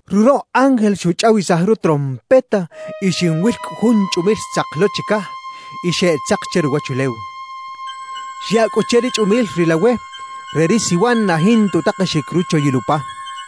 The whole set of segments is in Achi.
Ruroꞌ ángel xuchꞌawisaj rutrompeta, y xinwil cꞌu jun chꞌumil xtzak lo chicaj y xeꞌtzak che ruwachulew. Xyaꞌ cꞌu che ri chꞌumil ri lawe re ri siwan na jinta utakexic ruchoyil upa.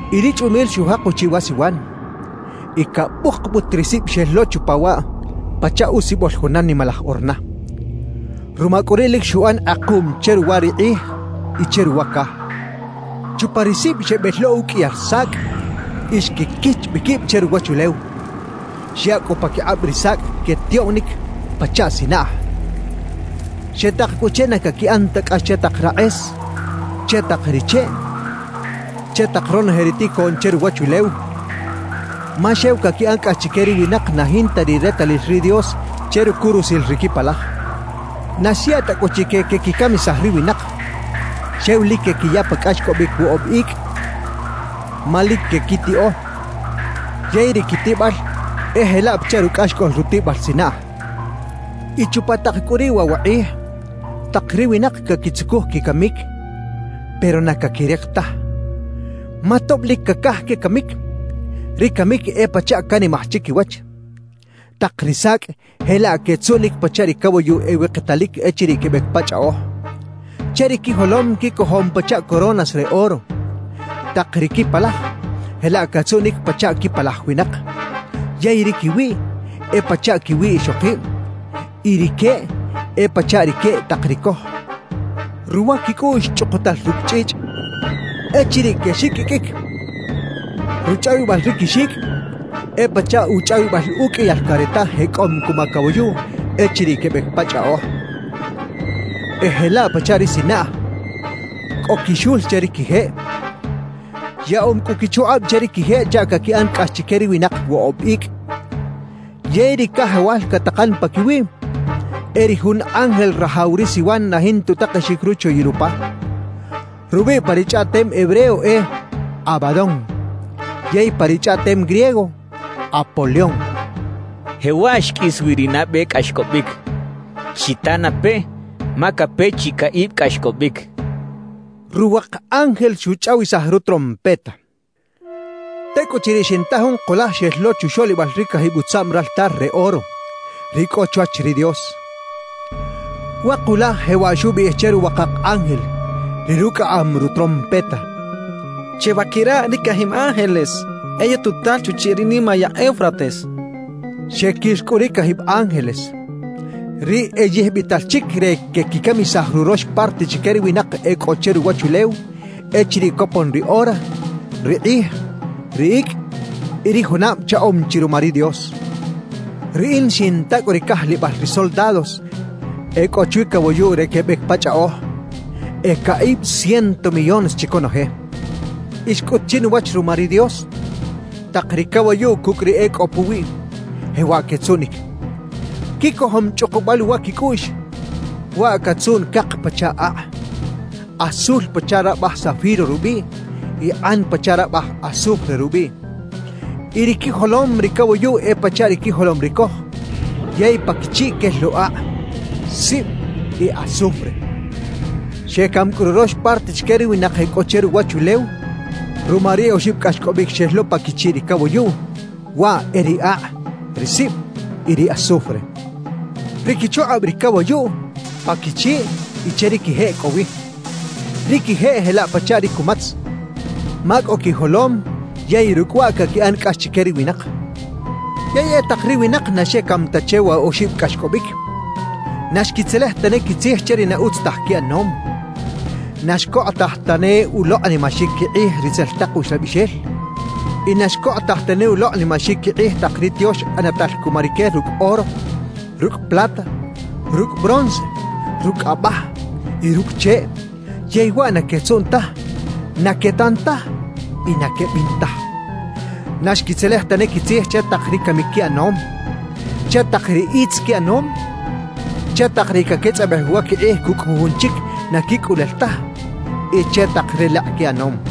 Y ri chꞌumil xujak uchiꞌ wa siwan, y cabukbut ri sib xel lo chupa waꞌ pachaꞌ usibol juna nimalaj orna. Ruma cꞌu riꞌ lic xuꞌan kꞌekuꞌm che ruwa ri kꞌij y che ruwa caj. Chupa ri sib xebel lo uqꞌuiyal sacꞌ y xquiquich bi quib che ruwachulew. Xyaꞌ cꞌu paquikꞌab ri sacꞌ quetiꞌoꞌnic pachaꞌ sinaꞌj. Xetak cꞌu che na caquiꞌan ta cꞌax che tak rakꞌes, che tak ri cheꞌ, che tak ronoje ri ticoꞌn che ruwachulew; ma xew caquiꞌan cꞌax chique ri winak na jinta ri retalil ri Dios che rucurusil ri quipalaj. Na xyaꞌ ta cꞌu chique quequicamisaj ri winak; xew lic quequiya pa cꞌaxcꞌobic woꞌob icꞌ, ma lic quequitiꞌo yey ri quitiꞌbal e jelaꞌ pachaꞌ rucꞌaxcꞌol rutiꞌbal sinaꞌj. Y chupa tak cꞌu riꞌ waꞌ wa kꞌij tak ri winak caquitzucuj quicamic, pero na caquirik taj; ma tob lic cacaj quecamic, ri camic e pachaꞌ canimaj chiquiwach. Tak ri sacꞌ jelaꞌ quetzuꞌnic pachaꞌ ri cawayuꞌ ewiktalic echiriꞌ quebec pa chꞌaꞌoj. Che ri quijolom quicojom pachaꞌ coronas re oro; tak ri quipalaj jelaꞌ catzuꞌnic pachaꞌ quipalaj winak. Yey ri quiwiꞌ e pachaꞌ quiwiꞌ ixokib, y ri queꞌ e pachaꞌ ri queꞌ tak ri coj. Ruwa quicꞌuꞌx chꞌukutal rucꞌ chꞌichꞌ. Echiriꞌ quexiqꞌuiqꞌuic, ruchꞌawibal ri quixicꞌ e pachaꞌ uchꞌawibal uqꞌuiyal careta jecꞌom cuma cawayuꞌ echiriꞌ quebec pa chꞌaꞌoj. E jelaꞌ pachaꞌ ri sinaꞌj, cꞌo quixul che ri quijeꞌ. Yaꞌom cꞌu quichukꞌab che ri quijeꞌ chaꞌ caquiꞌan cꞌax chique ri winak woꞌob icꞌ. Yey ri cajawal catakan paquiwiꞌ e ri jun ángel rajaw ri siwan na jinta utakexic ruchoyil upa. Rubiꞌ pa ri chꞌaꞌtem hebreo e “Abadón”, yey pa ri chꞌaꞌtem griego “Apolión”. Jewaꞌ xqꞌuis wi ri nabe cꞌaxcꞌobic. Chita na peꞌ, ma cape chi caꞌib cꞌaxcꞌobic. Ruwak ángel xuchꞌawisaj rutrompeta. Tecꞌuchiriꞌ xinta jun kulaj xel lo chuxoꞌlibal ri cajib utzaꞌm raltar re oro, ri cꞌo chwach ri Dios. Wa kulaj jewaꞌ xubiꞌij che ruwakak ángel, ri rucꞌaꞌam rutrompeta: «Chebaquira ri cajib ángeles e yututal chuchiꞌ ri nimayaꞌ Eufrates» xchaꞌ. Xequir cꞌu ri cajib ángeles, ri e yijbital chic re quequicamisaj rurox parte chique ri winak e cꞌo che ruwachulew echiriꞌ copon ri ora, ri kꞌij, ri icꞌ y ri junab chaꞌom chi ruma ri Dios. Riꞌin xinta cꞌu ri cajlibal ri soldados e cꞌo chwi cawayuꞌ re quebec pa chꞌaꞌoj, e caꞌib ciento millones chi conoje. Y xcꞌut chinuwach ruma ri Dios, tak ri cawayuꞌ cucꞌ ri e cꞌo puwiꞌ, jewaꞌ quetzuꞌnic: Quicojom chꞌukubal uwa quicꞌuꞌx, waꞌ catzuꞌn cak pachaꞌ akꞌ, azul pachaꞌ rabaj zafiro rubiꞌ y kꞌan pachaꞌ rabaj azufre rubiꞌ. Y ri quijolom ri cawayuꞌ e pachaꞌ ri quijolom ri coj yey pa quichiꞌ quel lo akꞌ, sib y azufre. Xecam cꞌu rurox parte chique ri winak e cꞌo che ruwachulew ruma ri oxib cꞌaxcꞌobic xel lo pa quichiꞌ ri cawayuꞌ; waꞌ e ri akꞌ, ri sib y ri azufre. Ri quichukꞌab ri cawayuꞌ pa quichiꞌ y che ri quijeꞌ cꞌo wi. Ri quijeꞌ jelaꞌ pachaꞌ ri cumatz, ma cꞌo quijolom yey rucꞌ waꞌ caquiꞌan cꞌax chique ri winak. Yey e tak ri winak na xecam ta che wa oxib cꞌaxcꞌobic, na xquitzelej tane quitzij che ri na utz taj quiꞌanom. Na xcokꞌotaj tane ulokꞌnimaxic quikꞌij ritzel tak uxlabixel y na xcokꞌotaj tane ulokꞌnimaxic quikꞌij tak ri tiox ꞌanatal cuma rique rucꞌ oro, rucꞌ plata, rucꞌ bronce, rucꞌ abaj y rucꞌ cheꞌ; yey waꞌ na quetzuꞌn taj, na quetan taj y na quebin taj. Na xquitzelej tane quitzij che tak ri camic quiꞌanom, che tak ri itz quiꞌanom, che tak ri caquetzꞌabej uwa quikꞌij cucꞌ jujun chic na quicꞌulel taj y che tak relekꞌ quiꞌanom.